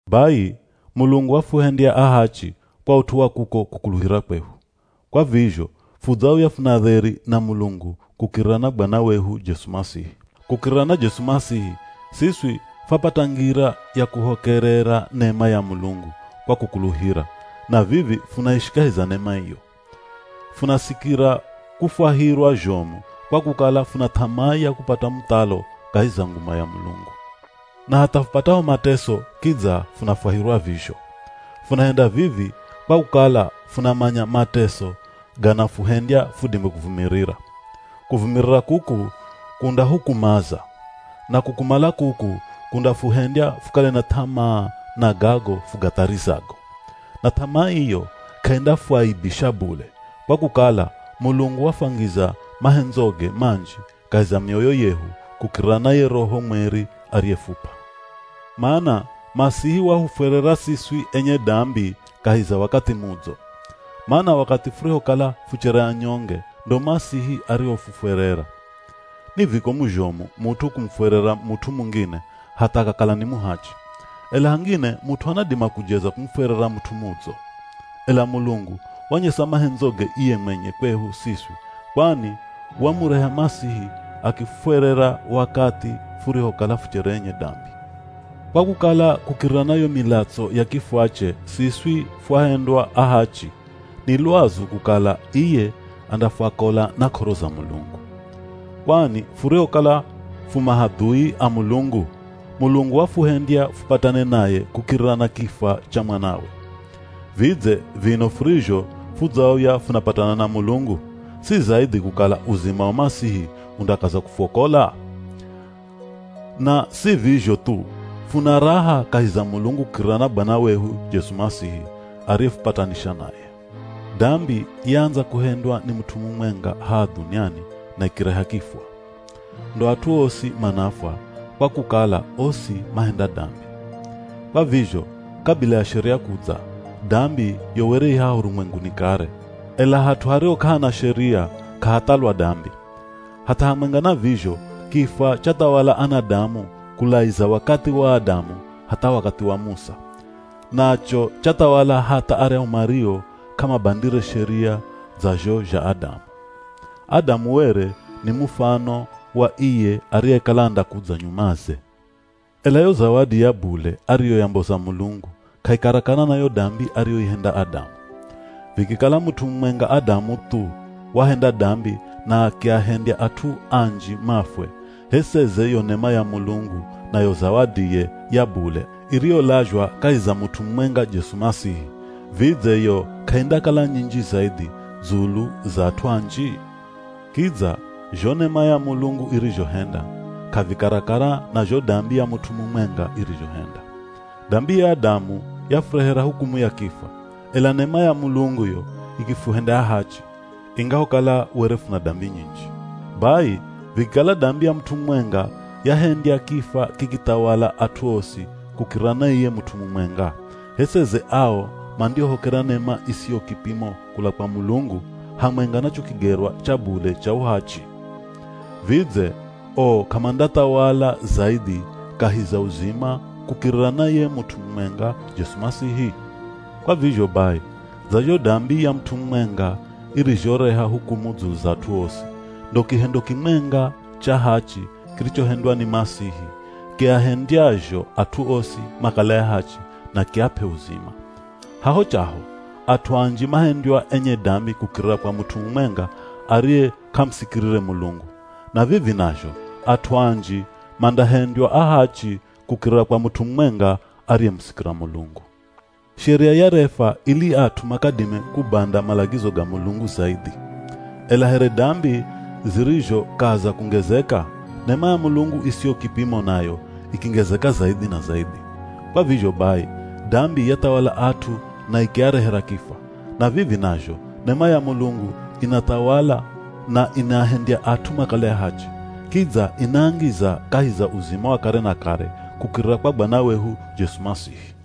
Bai, Mulungu wafuhendya ahachi kwa ut'u wa kuko kukuluhira kwehu. Kwa vizho fudzauya funa dheri na Mulungu kukirira na Bwana wehu Jesu Masihi. Kukirira na Jesu Masihi, siswi fwapata ngira ya kuhokerera nema ya Mulungu kwa kukuluhira, na vivi funaishi kahi za nema iyo. Funasikira kufwahirwa zhomu kwa kukala funa th'amaa ya kupata muthalo kahi za nguma ya Mulungu. Na hatha fupataho mateso kidza funafwahirwa vizho. Funahenda vivi kwa kukala funamanya mateso ganafuhendya fudime kuvumirira. Kuvumirira kuku kundahukumaza, na kukumala kuku kundafuhendya fukale na th'amaa na gago fugatharizago. Na th'amaa iyo k'aindafuaibisha bule, kwa kukala Mulungu wafwangiza mahendzoge manji kahi za mioyo yehu kukirira na ye Roho Mweri ariyefup'a. Mana Masihi wahufwerera siswi enye dambi kahi za wakathi mudzo. Mana wakathi furihokala fuchere anyonge ndo Masihi arihofufwerera. Ni vikomu zhomu mut'u kumufwerera mut'u mungine hatha akakala ni muhachi. Ela hangine mut'u anadima kujeza kumufwerera mut'u mudzo. Ela Mulungu wanyesa mahendzoge iye mwenye kwehu siswi kwani wamureha Masihi akifufwerera wakathi furihokala fuchere enye dambi. Kwa kukala kukirira na yo milatso ya kifwache siswi fwahendywa ahachi, ni lwazu kukala iye andafwakola na k'oro za Mulungu. Kwani furihokala fu mahadhui a Mulungu, Mulungu wafuhendya fupatane naye kukirira na kifwa cha Mwanawe. Vidze vino furizho fudzauya funapatana na Mulungu, si zaidhi kukala uzima wa Masihi undakaza kufuokola? Na si vizho thu, funa raha kahi za Mulungu kukirira na Bwana wehu Jesu Masihi, ariyefupatanisha naye. Dambi yaandza kuhendwa ni mut'u mumwenga haha dhuniani na ikireha kifwa. Ndo at'u osi manafwa, kwa kukala osi mahenda dambi. Kwa vizho kabila ya Sheria kudza, dambi yo were i haha urumwenguni kare. Ela hat'u hariho k'ahana Sheria, k'ahathalwa dambi. Hatha hamwenga na vizho kifwa chathawala anadamu kulaiza wakathi wa Adamu hatha wakathi wa Musa. Nacho chathawala hatha aryahu mario k'amabandire Sheria dza zho zha Adamu. Adamu were ni mufano wa iye ariyekala andakudza nyumaze. Ela yo zawadi ya bule ariyoyamboza Mulungu k'aikarakara na yo dambi ariyoihenda Adamu. Vikikala mut'u mumwenga Adamu thu wahenda dambi na akiahendya at'u anji mafwe, h'e seze yo nema ya Mulungu na yo zawadiye ya bule iriyolazhwa kahi za mut'u mumwenga Jesu Masihi, vidze yo k'aindakala nyinji zaidhi dzulu za at'u anji? Kidza zho nema ya Mulungu irizhohenda, k'avikarakara na zho dambi ya mut'u mumwenga irizhohenda. Dambi ya Adamu yafurehera hukumu ya kifwa, ela nema ya Mulungu yo ikifuhendya ahachi, ingahokala were funa dambi nyinji. Bai vikikala dambi ya mut'u mumwenga yahendya kifwa kikithawala at'u osi kukirira na iye mut'u mumwenga; h'e seze ao mandiohokera nema isiyo kipimo kula kwa Mulungu, hamwenga na cho kigerwa cha bule cha uhachi. Vidze o k'amandathawala zaidhi kahi za uzima kukirira na ye mut'u mumwenga, Jesu Masihi? Kwa vizho bai, dza zho dambi ya mut'u mumwenga irizhoreha hukumu dzulu za at'u osi, ndo kihendo kimwenga cha hachi kirichohendwa ni Masihi kiahendyazho at'u osi makale ahachi na kiap'e uzima. Haho chaho, at'u anji mahendywa enye dambi kukirira kwa mut'u mumwenga ariye k'amusikirire Mulungu. Na vivi nazho, at'u anji mandahendywa ahachi kukirira kwa mut'u mumwenga ariyemusikira Mulungu. Sheria yarefwa ili at'u makadime kubanda malagizo ga Mulungu zaidhi. Ela here dambi zirizhokaza kungezeka, nema ya Mulungu isiyo kipimo nayo ikingezeka zaidhi na zaidhi. Kwa vizho bai, dambi yathawala at'u na ikiarehera kifwa. Na vivi nazho, nema ya Mulungu inathawala na inahendya at'u makale ahachi, kidza inaangiza kahi za uzima wa kare na kare kukirira kwa Bwana wehu Jesu Masihi.